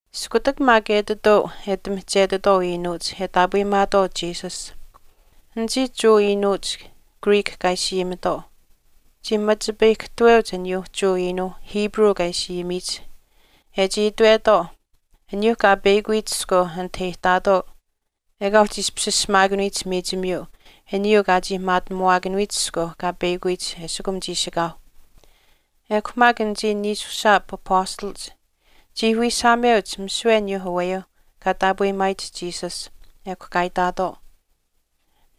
Iskutak maak etituu e ati mihchetitwaau iinuuch e taapweyimaatwaau Jesus, anichii Jewa iinuuch Greek kaa ishi ayimitwaau chii machipayikahtaweuch aniyuu Jewa iinuu Hebrew kaa ishi ayimiyich e chii itwetwaau aniyuu kaa paahpeyakuyich iskweu anit e ihtaatwaau ekaa uhchi ishpish ashamaakanuyich miichimiyuu aniyuu kaa chii maatinamuwaakanuyich iskweu kaa peyakuyich eshikum chiishikaau. Ekw maak anichii niishushaap apastalach chii wiishaameuch misiwe aniyuu aweyuu kaa taapweyimaayich Jesus, ekw kaa itaatwaau,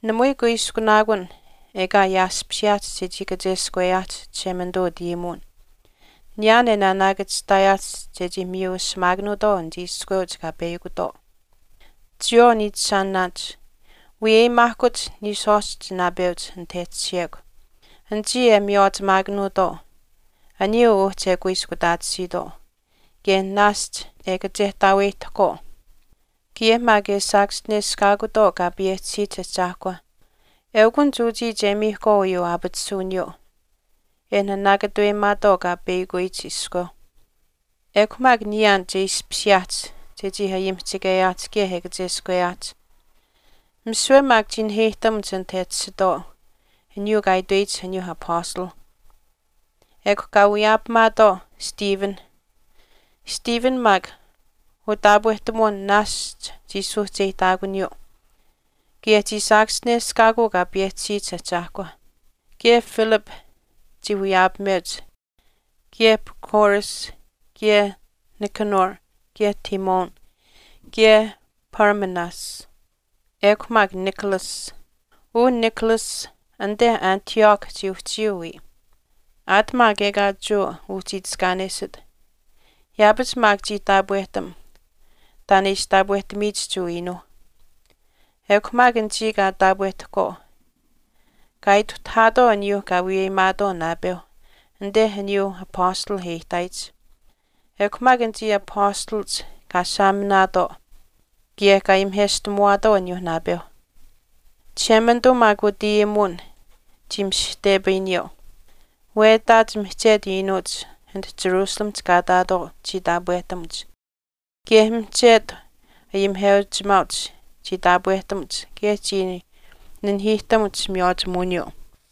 “Namui kuiskunaakun ekaa ayaashpishiyaahch chechii kacheskweyaahch Chishemanituu utayimuwin niyaan e naanaakachihtaayaach chechii miyu ashamaakanuutwaau anichii iskweuch kaa peyakutwaau. Chiyawaau niichishaanaanich, wiyaapamaahkuch niishwaashch naapeuch anit e tashiyekw anichii e miywaachimaakanuutwaau aniyuu uhchi e kuiskutaatisiitwaau kaye naashch e kachehtaaweyihtahkwaau kaye maak e saakaschineshkaakutwaau Kaa payehchisiyich Ahchaahkwa. Eukunich uchii che miihkwaau uyuu aapatisuwiniyuu e naanaakatuweyimaatwaau kaa paahpeyakuyich iskweu. Ekw maak niyaan che ishpishiyaahch chechii ayimihchikeyaahch kaye e kacheskweyaahch.” Misiwe maak chii naheyihtamuch anit e tashitwaau aniyuu kaa itweyich aniyuu apastalh. Ekw kaa wiyaapamaatwaau Stephen. Stephen maak utaapwehtamuwin naashch chii suuhcheyihtaakuniyuu, kaye chii saakaschineshkaakuu Kaa payehchisiyich Ahchaahkwa. Kaye Philip chii wiyaapameuch kaye Prochorus, kaye Nicanor, kaye Timon, kaye Parmenas, ekw maak Nicolaus. Uu Nicolaus anite Antioch chii uhchiyuu wiya, aat maak ekaa Jewa uhchi itiskaanesit yaapach maak chii taapwehtam taan e ishi taapwehtamiyich Jewa iinuuh. Ekw maak anichii kaa taapwehtahkwaau kaa ituhtahaatwaau aniyuuh kaa wiyaapamaatwaau naapeu anite aniyuuh apastalh e ihtaayich. Ekw maak anichii apastalach kaa saaminaatwaau kaye kaa ayimiheshtamuwaatwaau aniyuu naapeuh. Chishemanituu maak utayimuwin chii mishihtepayiniyuu. Wetaach mihchetu iinuuch anit Jerusalemihch kaa ihtaatwaau chii taapwehtamuch, kaye mihchetu ayimiheuchimaauch chii taapwehtamuch kaye chii nanihiihtamuch miywaachimuwiniyuu.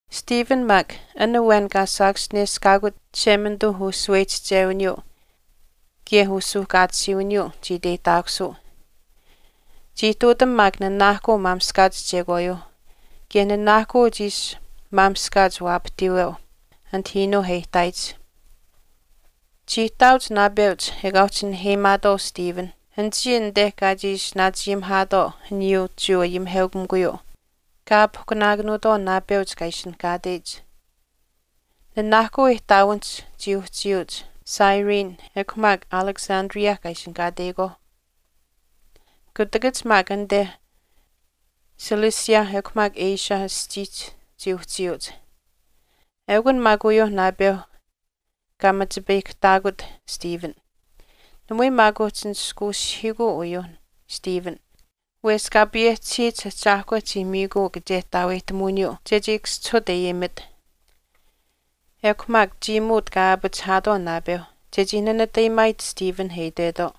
Stephen maak an awen kaa saachischineshkaakut Chishemanituu ushaweyihchichewiniyuu kaye usuuhkaatisiiwiniyuu chii iteyihtaakusuu, chii ihtuutam maak nanaahkuu maamishkaach chekwaayuuh kaye nanaahkuu chii ishi maamishkaach waapahtiiweu anit iinuu e ihtaayich. Chii ihtaauch naapeuch ekaa uhchi naheyimaatwaau Stephen, anichii anite kaa chii ishi naachayimihaatwaau aniyuu Jewa ayimiheukamikuyuu kaa aapihkunaakanuutwaau naapeuch, kaa ishinihkaateyich. Nanaahkuu ihtaawinihch chii uhchiyuuch Cyrene ekw maak Alexandria kaa ishinihkaateyikwaauh. Kutakach maak anite Cilicia ekw maak Asia aschiihch chii uhchiyuuch. Eukun maak uyuuh naapeu kaa machipayikahtaakut Stephen. Namui maak uhchii nishkuushihiikuu uyuuh Stephen wesh Kaa payehchisiyich Ahchaahkwa chii miikuu kachehtaaweyihtamuwiniyuu chechii kaschihut e ayimit. Ekw maak chiimuut kaa aapachihaatwaau naapeuh chechii nanatayaachimaayich Stephen e itwetwaau,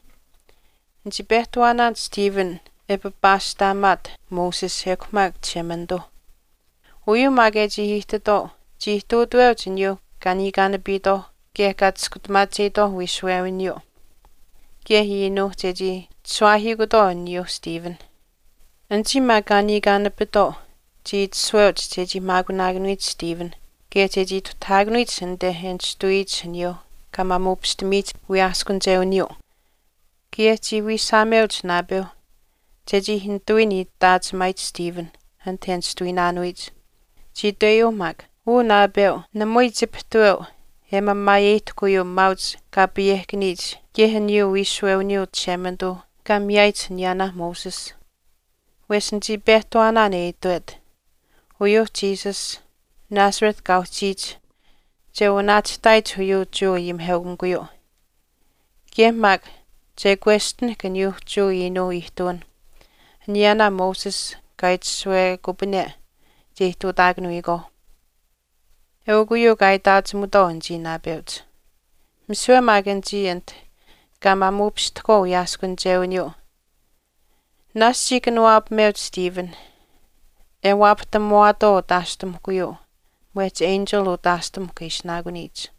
“Nichii pehtawaanaan Stephen e papaashtaamaat Moses ekw maak Chishemanituuh.” Uyuu maak e chii ihtitwaau chii ihtuutaweuch aniyuu kaa niikaanapiitwaauh kaye kaa chiskutamaacheyitwaauh wiishuwewiniyuu kaye iinuuh chechii chishuwaahiikutwaau aniyuu Stephen. Anichii maak kaa niikaanapitwaau chii itashuweuch chechii maakunaakanuyich Stephen kaye chechii ituhtahaakanuyich anite e nishtuwiyich aniyuuh kaa maamuupishtamiyich wiyaaskunichewiniyuu. Kaye chii wiishaameuch naapeuh chechii nitawiin itaachimaayich Stephen anit e nishtuwiinaanuyich. Chii itweyuuh maak, “Uu naapeu, namui chipihtuweu e mamaayeyihtahk uyuu maauch kaa payehkaniyich kaye aniyuu wiishuwewiniyuu Chishemanituu kaa miyaayich aniyaanaa Moses. Wesh nichii pehtawaanaan e itwet, uyuuh Jesus, Nazareth kaa uhchiyich che wanaachihtaayich uyuu Jewa ayimiheukamikuyuu, kaye maak che kwestinahk aniyuuh Jewa iinuu ihtuwinh aniyaanaa Moses kaa itashuwekupane che ihtuutaakanuyikwaauh.” Eukw uyuu kaa itaachimutwaau anichii naapeuch. Misiwe maak anichii anit kaa maamuupishtahkwaau wiyaaskunichewiniyuu naashch chii kanuwaapameuch Stephen e waapahtamuwaatwaau utaashtamuhkuyuu mwehch enchil utaashtamuhkw e ishinaakuniyich.